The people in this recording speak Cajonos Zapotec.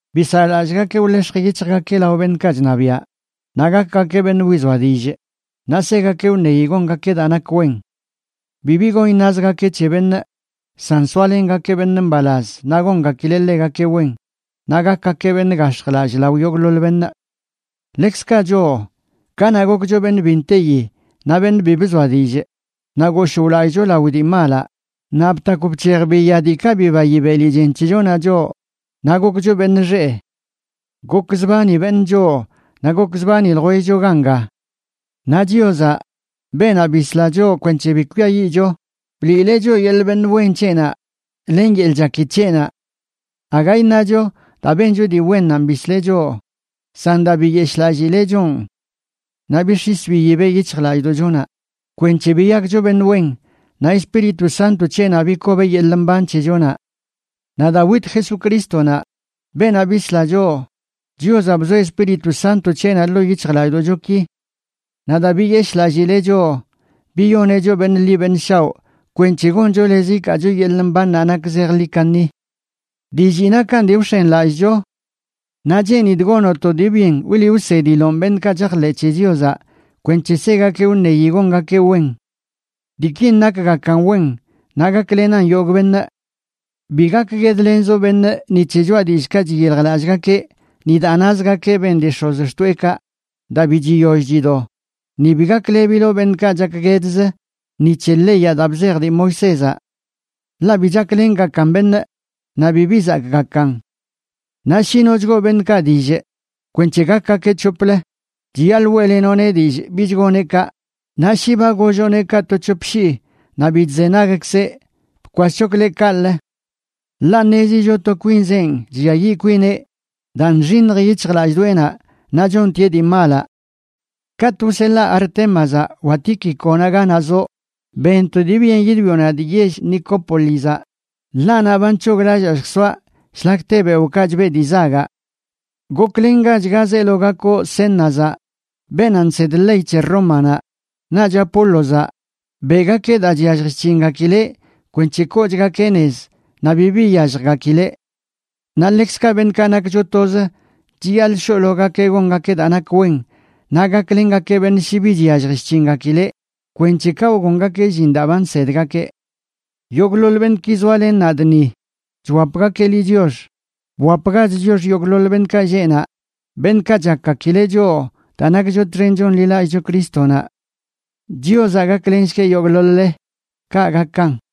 Bisaꞌlallꞌgakeꞌ wḻex̱j yic̱hjgakeꞌ lao beṉꞌkaꞌ chṉabiaꞌ, naꞌ gakgakeꞌ beṉꞌ wizoa dillꞌ, naꞌ segakeꞌ wṉeyi gongakeꞌ daa nak wen. Bibi gon iṉazgakeꞌ c̱he beṉꞌ, san soalengakeꞌ beṉꞌ mbalaz naꞌ gongakileꞌ ḻegakeꞌ wen, naꞌ gakgakeꞌ beṉꞌ gax̱jlallꞌ lao yogꞌḻoḻ beṉꞌ. Ḻekzkaꞌ choꞌ, kanaꞌ gokcho beṉꞌ bi nteyi naꞌ beṉꞌ bi bzoa dillꞌ, naꞌ goshꞌ wlallꞌcho lao dii malaꞌ, naꞌ btakw bc̱hej biya diikaꞌ bibayi beli chen c̱hechonaꞌ choꞌ, naꞌ gokcho beṉꞌ xeꞌ. Gokzbani beṉꞌ choꞌ naꞌ gokzbani ljwellcho ganga. Naꞌ Chiozaꞌ, beenaꞌ bisla choꞌ kwenc̱he bi kwiayiꞌcho, bliileꞌ choꞌ yeḻꞌ beṉꞌ wen c̱heꞌnaꞌ len yeḻꞌ chaki c̱heꞌnaꞌ. Aga iṉacho daa bencho dii wennanꞌ bisleꞌ choꞌ, san daa biyeshꞌlallꞌlileꞌ choꞌn. Naꞌ bix̱is biyibeꞌ yic̱hjlallꞌdoꞌchonaꞌ kwenc̱he biyakcho beṉꞌ wen, naꞌ Espíritu Santo c̱heꞌnaꞌ bikobeꞌ yeḻꞌ mban c̱hechonaꞌ. Naꞌ daa wit Jesucrístonaꞌ, beenaꞌ bisla choꞌ, Chiozaꞌ bzoeꞌ Espíritu Santo c̱heꞌnaꞌ ḻoo yic̱hjlallꞌdoꞌchoki. Naꞌ daa biyeshꞌlallileꞌ choꞌ, biyoneꞌ choꞌ beṉꞌ ḻi beṉꞌ shaoꞌ kwenc̱he goncho lez ikaacho yeḻꞌ mbannaꞌ nak zejḻi kaṉi. Dillii nakan dii wx̱enlallꞌcho. Naꞌ cheenidꞌ gonoꞌ to dii byen wliꞌ wsediloꞌn beṉꞌkaꞌ chajḻeꞌ c̱he Chiozaꞌ kwenc̱he segakeꞌ wṉeyi gongakeꞌ wen. Diikin nakgakan wen naꞌ gaklenan yogꞌ beṉꞌ. Bi gakguedlenzoꞌ beṉꞌ ni c̱he choꞌa dillꞌkaꞌ chyiljlallꞌgakeꞌ, ni daa nazgakeꞌ ben dii x̱ozxtoeꞌkaꞌ daa bi chiyoll chido, ni bi gaklebiloꞌ beṉꞌkaꞌ chakguedz ni c̱he leyaꞌ daa bzej dii Moisézaꞌ. Ḻaꞌ bi chaklengakan beṉꞌ naꞌ bibi zakꞌgakan. Naꞌ shi no chgoo beṉꞌkaꞌ dillꞌ kwenc̱he gakgakeꞌ c̱hoplə, chiyaḻꞌ weꞌlenoꞌneꞌ dillꞌ bich goneꞌ kaꞌ, naꞌ shi ba golloꞌneꞌ kaꞌ to c̱hop shii naꞌ bi chzenagkzeꞌ, bkwaschokleꞌ kaꞌlə. Ḻaꞌ ṉezicho to kwinzenꞌ chlliayiꞌ kwineꞌ daa nxiṉj yic̱hjlallꞌdoꞌenaꞌ naꞌ chontieꞌ dii malaꞌ. Katꞌ wseḻaa Artémazaꞌ wa Tíquiconaꞌ ganaꞌ zoꞌ, ben to dii byen yidwioꞌ nadꞌ yell Nicópolizaꞌ, ḻaꞌ naꞌ ba nc̱hoglallaa lljsoaꞌ shlak te beoꞌkaꞌ chbeꞌ dii zagaꞌ. Goklengach ga zeelo gakoꞌ Zénazaꞌ, beenaꞌ nsed ley c̱he Rómanaꞌ, naꞌch Apólozaꞌ. Beꞌgakeꞌ daa chyallj chc̱hingakileꞌ kwenc̱he koochgakeꞌ nez naꞌ bibi iyalljgakileꞌ. Naꞌ ḻekzkaꞌ beṉꞌkaꞌ nakcho toz chiyaḻꞌ shoꞌlogakeꞌ gongakeꞌ daa nak wen naꞌ gaklengakeꞌ beṉꞌ shi bi chyallj chc̱hingakileꞌ kwenc̱he kaꞌ wgongakeꞌ llin daa ba nsedgakeꞌ. Yogꞌḻoḻ beṉꞌki zoalen nadꞌ ni chwapgakeꞌ liꞌ chiox. Bwapgach chiox yogꞌḻoḻ beṉꞌkaꞌ lleꞌ naꞌ, beṉꞌkaꞌ chakgakileꞌ choꞌ daa nakcho txen chonḻilallꞌcho Crístonaꞌ. Chiozaꞌ gaklenshgueꞌ yogꞌḻoḻ-le. Kaꞌ gakan.